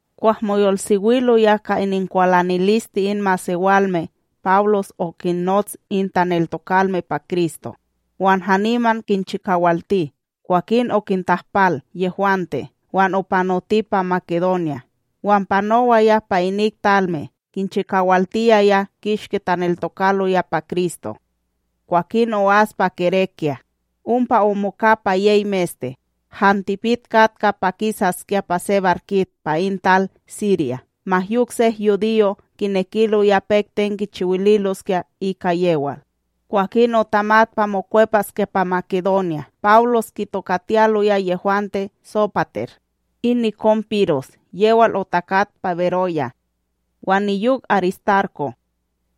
Kwah moyolsewiloya ka ininkwalaniliste in masewalme, Pawlos okinnots in taneltokalme pa Kristo wan haniman kinchikawalti; kwakin okintahpal yehwante wan opanoti pa Makedonya. wan panowaya pa inik talme kinchiwaltiyaya kishki taneltokaloya pa Kristo, kwakin o'as pa Gerékya. Ompa omoka pa yey meste, han tipik katka pa takisaskya pa se barkit pa in tal Sirya, ma yok sek yudiyo' kinekiloya pek ten kichiwililoskya ika yewal. Kwakin otamat pa mokwepaskya pa Makedonya. Pawlos kitokatiyaloya yehwante Sópater, in nikon Piros yewal otakat pa Beroya, wan niyok Aristarko'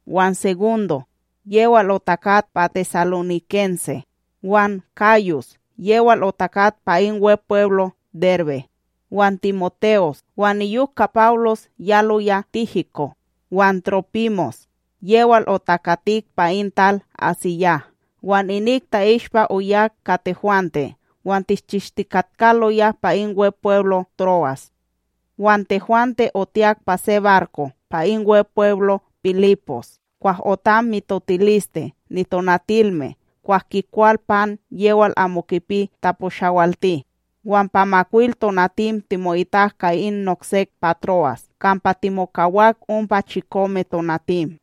wan Segundo yewal otakat pa tesalonikense, wan Gayus yewal otakat pa in Wepweblo Derbe, wan TimoTe'os, wan niyok ka Pawlos yaloya Tíhiko' wan Trópimos yewal otakatik pa in tal AsíYah. Wan inik ta'ishpa oyak ka tehwante wan tishchishtikatkaloya pa in Wepweblo Tro'as. Wan tehwante, otiyak pa se barko pa in Wepweblo Pilipos kwah otam mitotiliste nitonatilme kwah kikwal pan yewal amo kipi taposhawalti, wan pa makwil tonatim timo'itak ka in noksek pa Tro'as, kampa timokawak ompa chikome tonatim.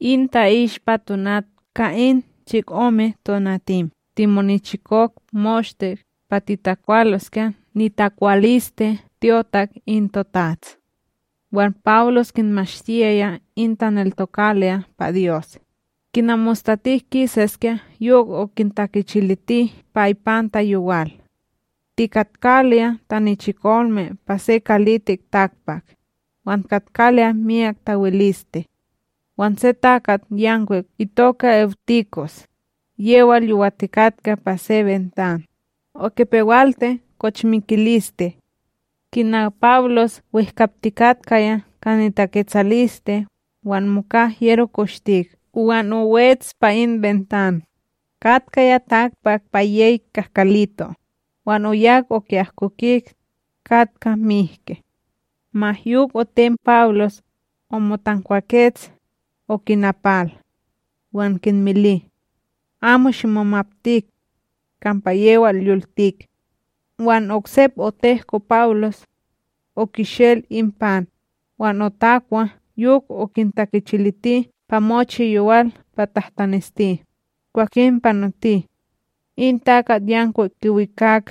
In ta'ishpa tonat ka in chikomeTonatim timonichikok moshte pa tikwaloskya nitakwaliste tyotak in toTats. Wan Pawlos kinmashtiyaya in taneltokaloya pa Dyos, kina mostatik kisaskya yok okintakichiliti pa ipanta yowal. Tikatkaloya tanichikolme pa se kalitik takpak, wan katkaloya myak tawiliste; wan se takatYankwik itoka Ewtikos, yewal yowatikatka pa se bentan, okipewalti kochmikiliste. Kina Pawlos wehkaptikatkaya ka nitaketsaliste, wan moka hyero koshtik wan owets pa in bentan, katkaya takpak pa yey kahkalito, wan oyak oki'ahkokik, katkaya mihke. Ma yok otem Pawlos, omotankwakets, okinapal. Wan kinmili: —Amo shimomaptik; kampa yewal yoltik. Wan oksep otehko Pawlos; okishel in pan, wan otakwa yok okintakichiliti pa mochi yowal pa tahtaneshti, kwakin panoti. In takatYankwik kiwikak,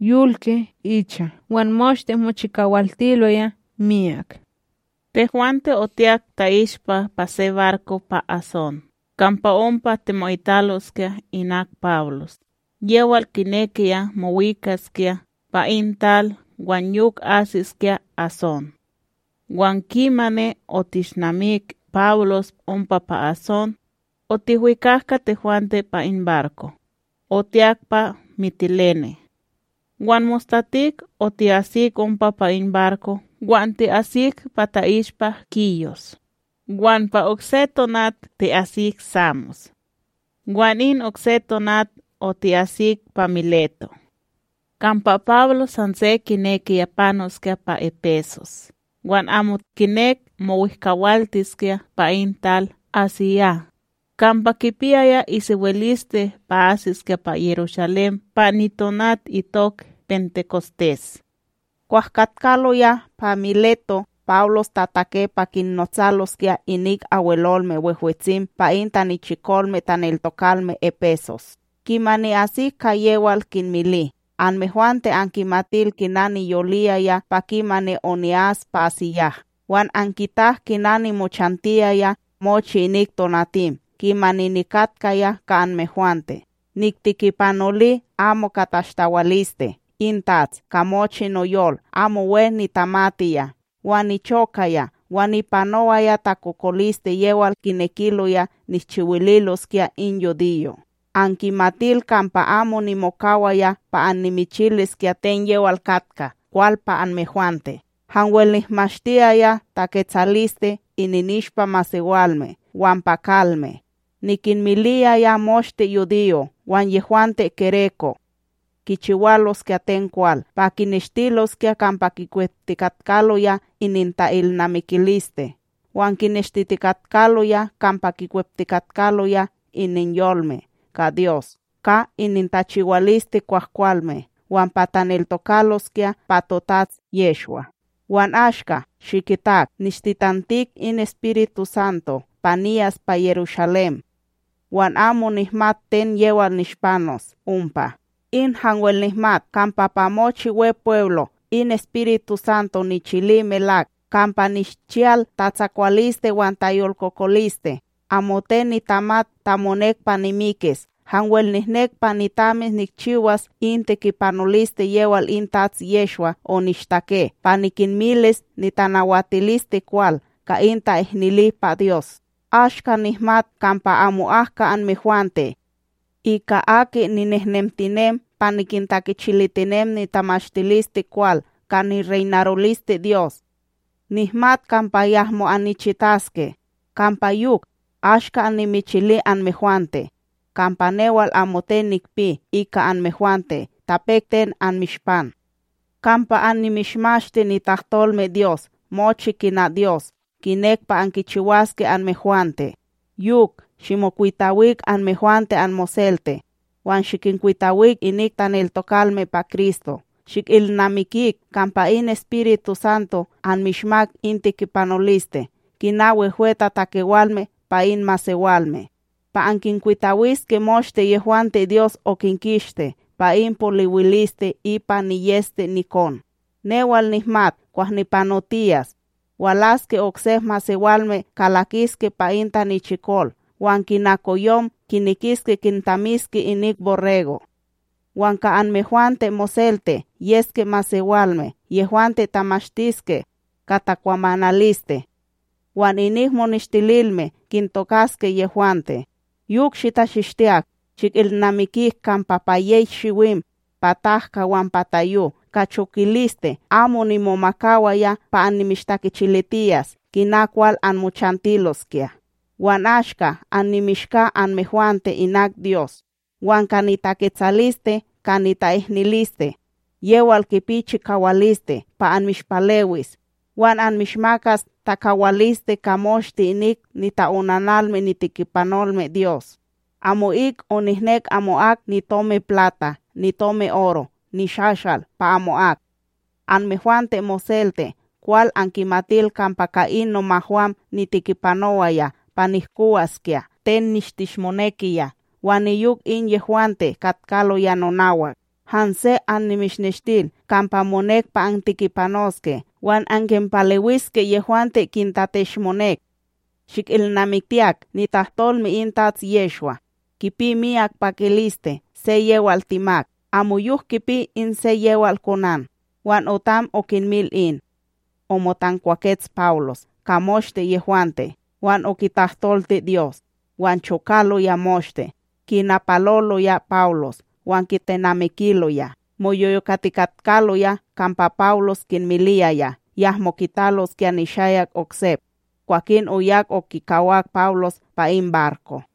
yolki icha wan moshte mochikawaltiloya miyak. Tehwante otiyak ta'ishpa pa se barko pa Asón kampa ompa timo'italoskya inak Pawlos yewal kinekiya mowikaskya pa in tal wan yok asiskya Asón. Wan kimani otishnamik Pawlos ompa pa Asón, otihwikak ka tehwante pa in barko, otiyak pa Mitilene. Wan mostatik otikisak ompa pa in barko wan ti'asik pa ta'ishpa Kíyos, wan pa okse tonat oti'asik Samos. Wan in okse tonat oti'asik pa Miléto'. Kampa Pawlos hanse kinekiya panoskya pa Epesos wan amo kinek mowehkawaltiskya pa in tal AsíYah, kampa kipiyaya isewiliste pa asiskya pa Yerushalém pa nitonat itok Pentekostés. Kwah katkaloya pa Miléto', Pawlos tatake pa kinnotsaloskya inik Abwelolme Wehwetsim pa in tanichikolme taneltokalme Epesos, kimani asik ka yewal kinmili: —Anmehwante ankimatil kina niyoliyaya pa kimani oni'as pa AsíYah wan ankitak kina nimochantiyaya mochi inik tonatim kimani nikatkaya ka anmehwante. Niktekipanoli amo ka tashtawaliste in TATS ka mochi noyol amo we nitamatiya wan nichokaya, wan nipanowaya takokoliste yewal kinekiloya nishchiwililoskya in yudiyo'. Ankimatil kampa amo nimokawaya pa annimichiliskya ten yewal katka kwal pa anmehwante, hanwel nihmashtiyaya taketsaliste ininishpa masewalme wan pa kalme. Nikinmiliyaya moshte yudiyo' wan yehwante gereko' kichiwaloskya ten kwal pa kineshtiloskya kampa kikweptikatkaloya ininta'ilnamikiliste wan kineshtitikatkaloya kampa kikweptikatkaloya ininyolme ka Dyos ka inintachiwaliste kwahkwalme wan pa taneltokaloskya pa toTats Yehshwa. Wan ashka, shikitak, nishtitantik in EspirituSanto pa niyas pa Yerushalém, wan amo nihmat ten yewal nishpanos ompa. In hanwel nihmat kampa pa mochi Wepweblo' in, EspirituSanto nichili melak kampa nishchiyal tatsakwaliste wan tayolkokoliste. Amoten nitamat ta monek pa nimikis hanwel nihnek pa nitamis nikchiwas in tekipanoliste yewal in Tats Yehshwa onishtake pa nikinmilis nitamashtilisteKwal ka in ta'ihnili pa Dyos. ’Ashka nihmat kampa amo'ak ka anmehwante, ika aki ninehnemtinem pa nikintakichilitinem nitamashtilisteKwal ka nireynaroliste Dyos, nihmat kampa yahmo annichitaske. Kampa yok, ashka annimichili anmehwante, kampa newal amoten nikpi ika anmehwante ta pek ten anmishpan, kampa annimishmashti nitahtolmeDyos mochi kina Dios, kinek pa ankichiwaske anmehwante. Yok, shimokwitawik anmehwante anmoselte, wan shikinkwitawik inik taneltokalme pa Kristo. Shikilnamikik kampa in EspirituSanto anmishmak in tekipanoliste kina wehwetatakewalme pa in masewalme, pa ankinkwitawiske moshte yehwante Dyos okinkisti pa in poliwiliste ipa niyEste nikon. Newal nihmat kwah nipanotiyas, walaske oksek masewalme kalakiske pa in tanichikol wan kina koyom kinekiske kintamiske inik borrego'. Wan ka anmehwante moselte yeske masewalme yehwante tamashtiske ka takwamanaliste, wan inik moneshtililme kintokaske yehwante. Yok shitachishtiyak, shikilnamikik kampa pa yey shiwim pa tahka wan tayo, ka chokaliste, amo nimomakawaya pa annimishtakichilitiyas kina kwal anmochantiloskya. ’Wan ashka annimishka anmehwante inak Dyos wan ka nitaketsaliste ka nita'ihniliste, yewal kipi chikawaliste pa anmishpalewis wan anmishmakas takawaliste ka moshte inik nita'onanalme nitekipanolme Dyos. Amo'ik onihnek amo'ak nitomiPlata nitomiOro nishashal pa amo'ak; anmehwante moselte kwal ankimatil kampa ka in nomahwam nitekipanowaya pa nihkowaskya ten nishteshmonekiya wan niyok in yehwante katkaloya nonawak. Hanse annimishneshtil kampa monek pa antekipanoske wan ankinpalewiske yehwante kintateshmonek, shikilnamiktiyak nitahtolme in Tats Yehshwa: “Kipi miyak pakiliste se yewal timak, amoyok kipi in se yewal konan.” Wan otam okinmil in, omotankwakets Pawlos ka moshte yehwante wan okitahtolti Dyos. Wan chokaloya moshte, kinapaloloya Pawlos wan kitenamikiloya. Moyolkokotikatkaloya kampa Pawlos kinmiliyaya yahmo kitaloskya nishayak oksep. Kwakin oyak okikawak Pawlos pa in barko.